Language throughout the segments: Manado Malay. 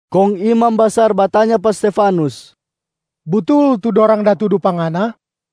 Kong imam basar batanya pa Stefanus, “Butul tu dorang da tudu pa ngana?”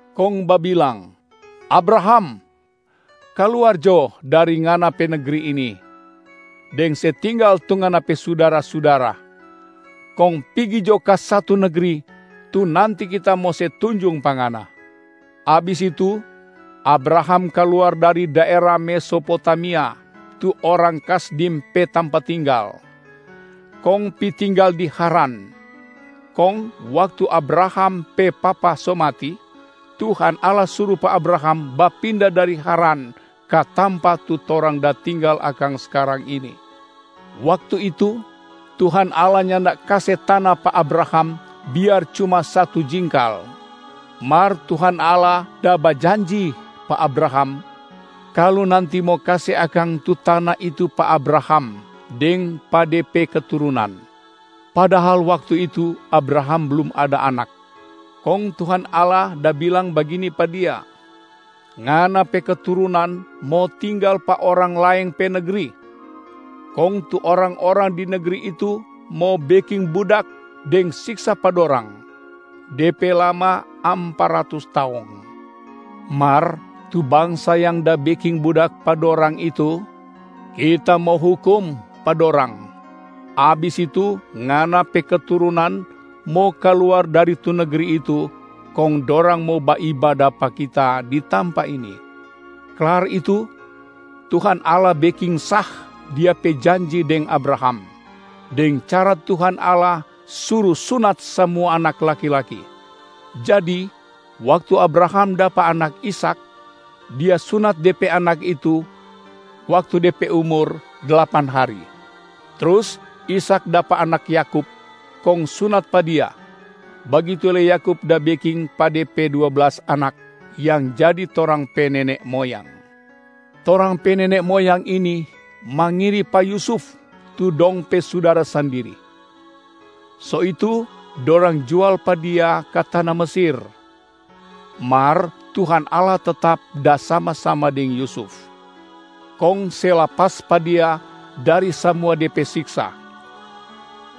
kong babilang, ‘Abraham, kaluar jo dari ngana pe negri ini deng se tinggal tu ngana pe sudara-sudara, kong pigi jo ka satu negri tu nanti Kita mo se tunjung pa ngana.’ Abis itu, Abraham kaluar dari daera Mesopotamia tu orang Kasdim pe tampa tinggal, kong pi tinggal di Haran. Kong waktu Abraham pe papa so mati, Tuhan Allah suru pa Abraham bapinda dari Haran ka tampa tu torang da tinggal akang skarang ini. Waktu itu, Tuhan Allah nyanda kase tana pa Abraham biar cuma satu jingkal. Mar Tuhan Allah da bajanji pa Abraham kalu nanti mo kase akang tu tana itu pa Abraham deng pa de pe keturunan, padahal waktu itu Abraham blum ada anak. Kong Tuhan Allah da bilang bagini pa dia, ‘Ngana pe keturunan mo tinggal pa orang laeng pe negri. Kong tu orang-orang di negri itu mo beking budak deng siksa pa dorang, de pe lama ampa ratus taong. Mar tu bangsa yang da beking budak pa dorang itu, Kita mo hukum pa dorang. Abis itu, ngana pe keturunan mo kaluar dari tu negri itu kong dorang mo baibada pa Kita di tampa ini.’ Klar itu, Tuhan Allah beking sah Dia pe janji deng Abraham, deng cara Tuhan Allah suru sunat samua anak laki-laki. Jadi waktu Abraham dapa anak Ishak, dia sunat de pe anak itu waktu de pe umur dlapan hari. Trus Ishak dapa anak Yakub kong sunat pa dia, bagitu lei Yakub da beking pa de pe dua blas anak yang jadi torang pe nene moyang. Torang pe nene moyang ini mangiri pa Yusuf tu dong pe sudara sandiri, so itu dorang jual pa dia ka tana Mesir. Mar Tuhan Allah tetap da sama-sama deng Yusuf, kong se lapas pa dia dari samua de pe siksa.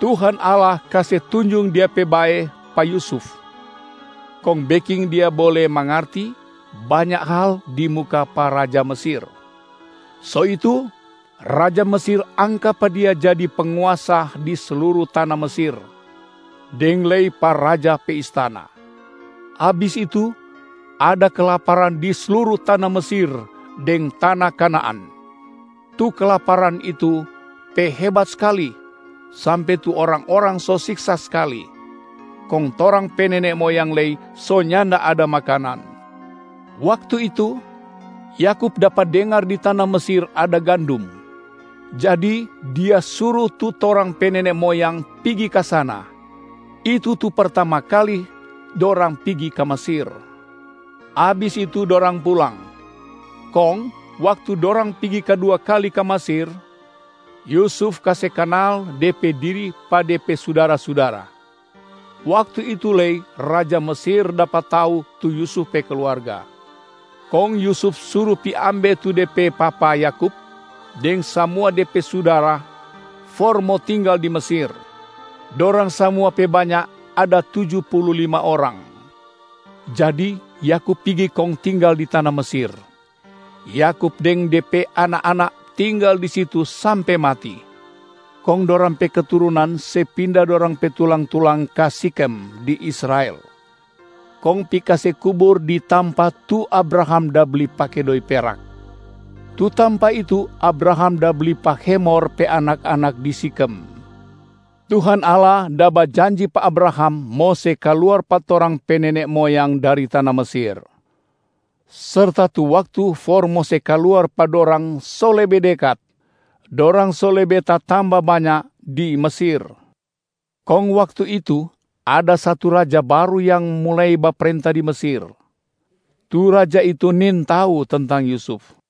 Tuhan Allah kase tunjung Dia pe bae pa Yusuf kong beking dia bole mangarti banya hal di muka pa raja Mesir. So itu, raja Mesir angka pa dia jadi penguasa di sluru tana Mesir deng lei pa raja pe istana. Abis itu ada kelaparan di sluru tana Mesir deng tana Kanaan. Tu kelaparan itu pe hebat skali sampe tu orang-orang so siksa skali, kong torang pe nene moyang lei so nyanda ada makanan. Waktu itu, Yakub dapa dengar di tana Mesir ada gandum. Jadi dia suru tu torang pe nene moyang pigi ka sana, itu tu pertama kali dorang pigi ka Mesir. Abis itu dorang pulang. Kong waktu dorang pigi kadua kali ka Mesir, Yusuf kase kanal de pe diri pa de pe sudara-sudara. Waktu itu lei raja Mesir dapa tau tu Yusuf pe kluarga. Kong Yusuf suru pi ambe tu de pe papa Yakub deng samua de pe sudara for mo tinggal di Mesir. Dorang samua pe banya ada tuju pulu lima orang. Jadi Yakub pigi kong tinggal di tana Mesir. Yakub deng de pe anak-anak tinggal di situ sampe mati. Kong dorang pe keturunan se pinda dorang pe tulang-tulang ka Shikem di Israel, kong pi kase kubur di tampa tu Abraham da bli pake doi perak. Tu tampa itu Abraham da bli pa Hemor pe anak-anak di Sikhem. Tuhan Allah da bajanji pa Abraham mo se kaluar pa torang pe nene moyang dari tana Mesir. Serta tu waktu for mo se kaluar pa dorang so lebe dekat, dorang so lebe tatamba banya di Mesir. Kong waktu itu, ada satu raja baru yang mulai baprenta di Mesir. Tu raja itu nintau tentang Yusuf.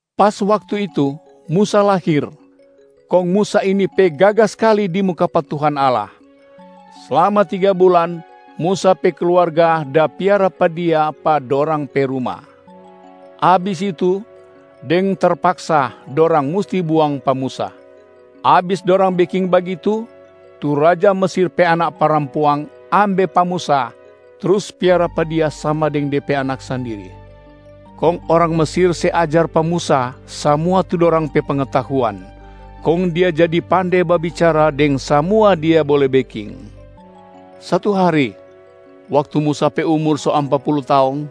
Pas waktu itu, Musa lahir. Kong Musa ini pe gaga skali di muka pa Tuhan Allah. Slama tiga bulan, Musa pe kluarga da piara pa dia pa dorang pe ruma. Abis itu, deng terpaksa dorang musti buang pa Musa. Abis dorang beking bagitu, tu raja Mesir pe anak parampuang ambe pa Musa trus piara pa dia sama deng de pe anak sandiri. Kong orang Mesir se ajar pa Musa samua tu dorang pe pengetahuan, kong dia jadi pande babicara deng samua dia bole beking. Satu hari, waktu Musa pe umur so ampa pulu taong,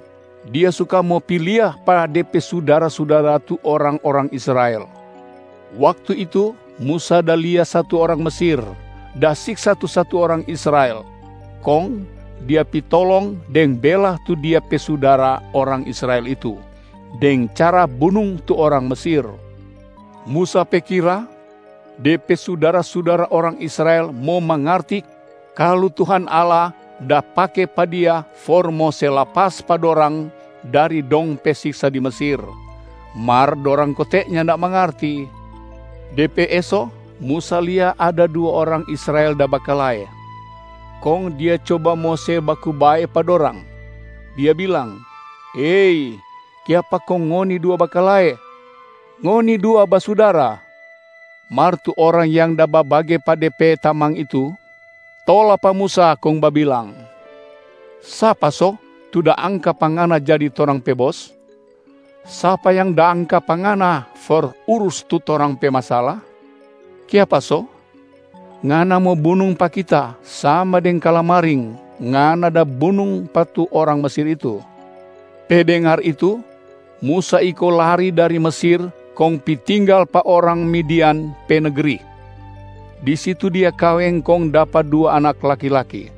dia suka mo pi lia pa de pe sudara-sudara tu orang-orang Israel. Waktu itu Musa da lia satu orang Mesir da siksa tu satu orang Israel, kong dia pi tolong deng bela tu dia pe sudara orang Israel itu deng cara bunung tu orang Mesir. Musa pe kira, de pe sudara-sudara orang Israel mo mangarti kalu Tuhan Allah da pake pa dia for mo se lapas pa dorang dari dong pe siksa di Mesir, mar dorang kote nyanda mangarti. De pe eso, Musa lia ada dua orang Israel da bakalae. Kong dia coba mo se baku bae pa dorang, dia bilang, ‘Hei! Kiapa kong ngoni dua bakalae? Ngoni dua basudara!’ Mar tu orang yang da babage pa de pe tamang itu, tola pa Musa kong babilang, ‘Sapa so tu da angka pa ngana jadi torang pe bos? Sapa yang da angka pa ngana for urus tu torang pe masala? Kiapa so, ngana mo bunung pa kita sama deng kalamaring ngana da bunung pa tu orang Mesir itu?’ Pe dengar itu, Musa iko lari dari Mesir kong pi tinggal pa orang Midian pe negri. Di situ dia kaweng kong dapa dua anak laki-laki.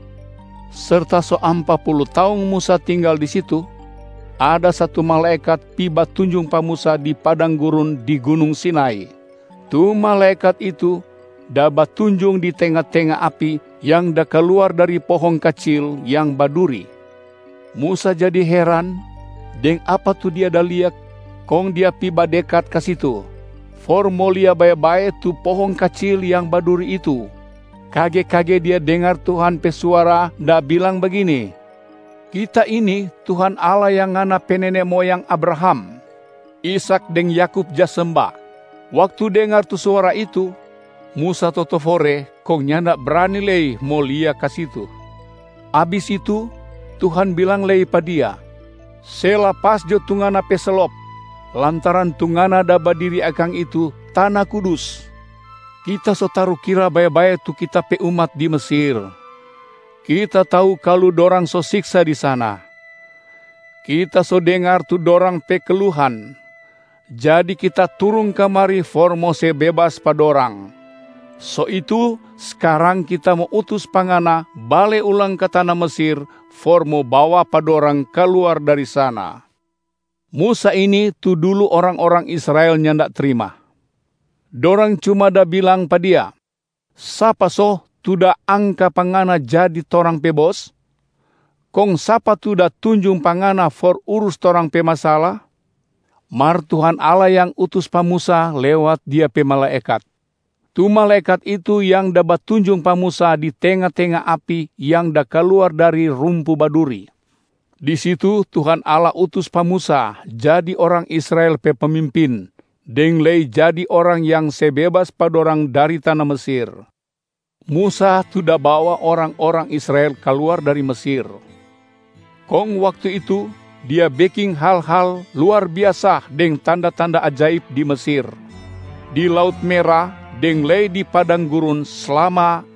Serta so ampa pulu taong Musa tinggal di situ, ada satu malaekat pi batunjung pa Musa di padang gurun di Gunung Sinai. Tu malaekat itu da batunjung di tenga-tenga api yang da kaluar dari pohong kacil yang baduri. Musa jadi heran deng apa tu dia da lia kong dia pi badekat ka situ for mo lia bae-bae tu pohong kacil yang baduri itu. Kage-kage dia dengar Tuhan pe suara da bilang bagini, ‘Kita ini, Tuhan Allah yang ngana pe nene moyang Abraham, Ishak deng Yakub ja semba.’ Waktu dengar tu suara itu, Musa totofore kong nyanda brani lei mo lia ka situ. Abis itu, Tuhan bilang lei pa dia, ‘Se lapas jo tu ngana pe slop, lantaran tu ngana da badiri akang itu tana kudus. Kita so tarukira bae-bae tu Kita pe umat di Mesir. Kita tau kalu dorang so siksa di sana. Kita so dengar tu dorang pe keluhan. Jadi Kita turung kamari for mo se bebas pa dorang. So itu, skarang Kita mo utus pa ngana bale ulang ka tana Mesir for mo bawa pa dorang kaluar dari sana.’ Musa ini tu dulu orang-orang Israel nyanda trima. Dorang cuma da bilang pa dia, ‘Sapa so tu da angka pa ngana jadi torang pe bos? Kong sapa tu da tunjung pa ngana for urus torang pe masala?’ Mar Tuhan Allah yang utus pa Musa lewat Dia pe malaekat. Tu malaekat itu yang da batunjung pa Musa di tenga-tenga api yang da kaluar dari rumpu baduri. Di situ Tuhan Allah utus pa Musa jadi orang Israel pe pemimpin deng lei jadi orang yang se bebas pa dorang dari tana Mesir. Musa tu da bawa orang-orang Israel kaluar dari Mesir, kong waktu itu dia beking hal-hal luar biasa deng tanda-tanda ajaib di Mesir, di Laut Mera deng lei di padang gurun slama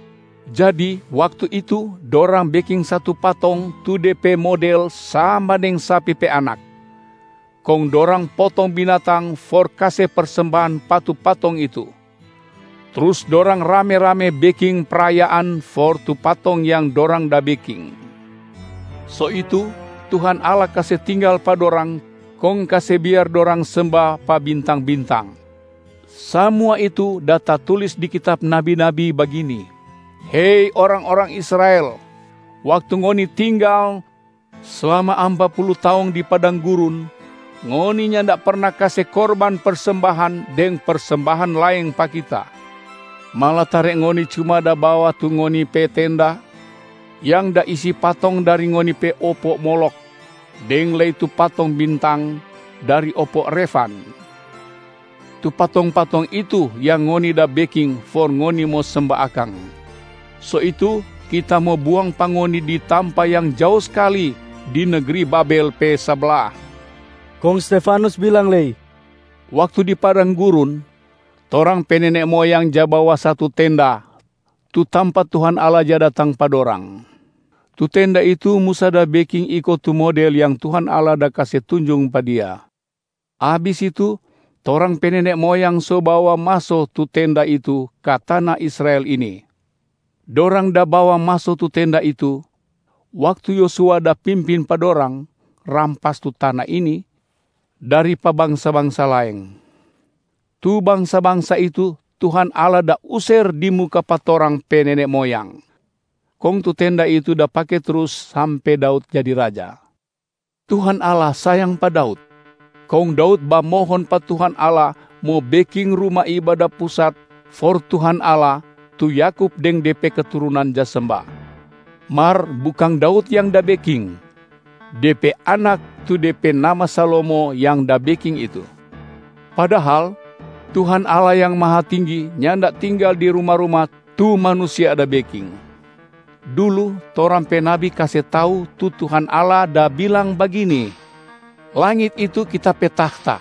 Jadi waktu itu, dorang beking satu patong tu de pe model sama deng sapi pe anak. Kong dorang potong binatang for kase persembahan pa tu patong itu, trus dorang rame-rame beking prayaan for tu patong yang dorang da beking. So itu Tuhan Allah kase tinggal pa dorang kong kase biar dorang semba pa bintang-bintang. Samua itu da tatulis di kitab nabi-nabi bagini, ‘Hei orang-orang Israel! Waktu ngoni tinggal slama ampa pulu taong di padang gurun, ngoni nyanda perna kase korban persembahan deng persembahan laeng pa Kita. Malatare ngoni cuma da bawa tu ngoni pe tenda yang da isi patong dari ngoni pe opo Molokh deng lei tu patong bintang dari opo Refan. Tu patong-patong itu yang ngoni da beking for ngoni mo semba akang. So itu Kita mo buang pa ngoni di tampa yang jao skali di negri Babel pe sabla.’” Kong Stefanus bilang lei, “Waktu di padang gurun, torang pe nene moyang ja bawa satu tenda tu tampa Tuhan Allah ja datang pa dorang. Tu tenda itu Musa da beking iko tu model yang Tuhan Allah da kase tunjung pa dia. Abis itu, torang pe nene moyang so bawa maso tu tenda itu ka tana Israel ini. Dorang da bawa maso tu tenda itu, waktu Yosua da pimpin pa dorang rampas tu tana ini dari pa bangsa-bangsa laeng. Tu bangsa-bangsa itu Tuhan Allah da user di muka pa torang pe nene moyang. Kong tu Tenda itu da pake trus sampe Daud jadi raja. Tuhan Allah sayang pa Daud. Kong Daud bamohon pa Tuhan Allah mo beking Ruma Ibada Pusat for Tuhan Allah tu Yakub deng de pe keturunan ja semba. Mar bukang Daud yang da beking, de pe anak tu de pe nama Salomo yang da beking itu. Padahal, Tuhan Allah yang Mahatinggi nyanda tinggal di ruma-ruma tu manusia da beking. Dulu, torang pe nabi kase tau tu Tuhan Allah da bilang bagini, ‘Langit itu Kita pe tahta,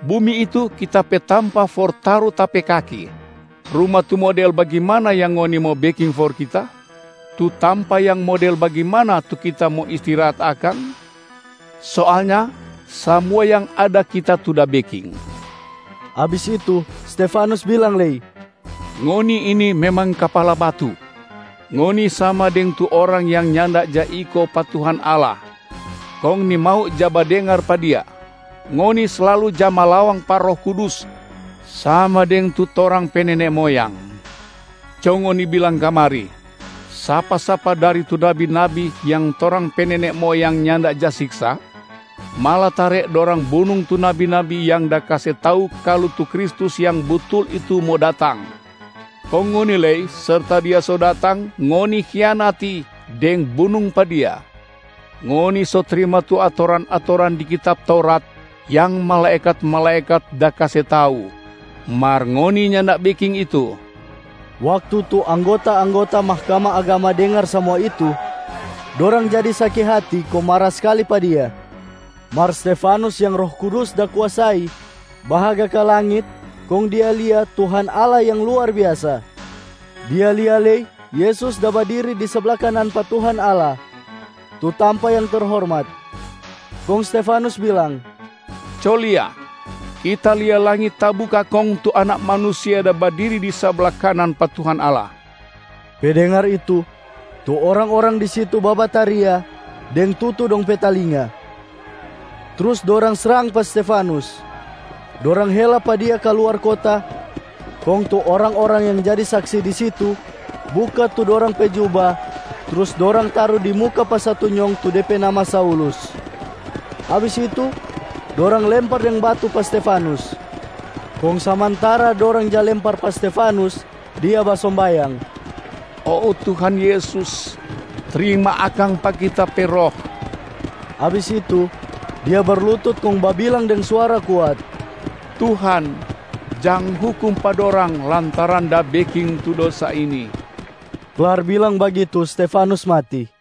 bumi itu Kita pe tampa for taru Ta pe kaki. Ruma tu model bagimana yang ngoni mo beking for Kita? Tu tampa yang model bagimana tu Kita mo istirahat akang? Soalnya, samua yang ada Kita tu da beking.’” Abis itu, Stefanus bilang lei, “Ngoni ini memang kapala batu! Ngoni sama deng tu orang yang nyanda ja iko pa Tuhan Allah kong nimau ja badengar pa Dia. Ngoni slalu ja malawang pa Roh Kudus sama deng tu torang pe nene moyang. Co ngoni bilang kamari, sapa-sapa dari tu nabi-nabi yang torang pe nene moyang nyanda ja siksa? Malatare dorang bunung tu nabi-nabi yang da kase tau kalu tu Kristus Yang Butul itu mo datang. Kong ngoni lei, serta Dia so datang, ngoni hianati deng bunung pa Dia. Ngoni so trima tu atoran-atoran di kitab Taurat yang malaekat-malaekat da kase tau, mar ngoni nyanda beking itu.” Waktu tu anggota-anggota Mahkamah Agama dengar samua itu, dorang jadi saki hati kong mara skali pa dia. Mar Stefanus yang Roh Kudus da kuasai, bahaga ka langit kong dia lia Tuhan Allah yang luar biasa, dia lia lei Yesus da badiri di sabla kanan pa Tuhan Allah, tu tampa yang terhormat. Kong Stefanus bilang, “Co lia! Kita lia langit tabuka kong tu Anak Manusia da badiri di sabla kanan pa Tuhan Allah.” Pe dengar itu, tu orang-orang di situ babataria deng tutu dong pe talinga, trus dorang srang pa Stefanus. Dorang hela pa dia kaluar kota. Kong tu orang-orang yang jadi saksi di situ buka tu dorang pe juba trus dorang taru di muka pa satu nyong tu de pe nama Saulus. Abis itu, dorang lempar deng batu pa Stefanus. Kong samantara dorang ja lempar pa Stefanus, dia basombayang, “Oh Tuhan Yesus, trima akang pa kita pe roh.” Abis itu, dia berlutut kong babilang deng suara kuat, “Tuhan, jang hukum pa dorang lantaran da beking tu dosa ini!” Klar bilang bagitu Stefanus mati.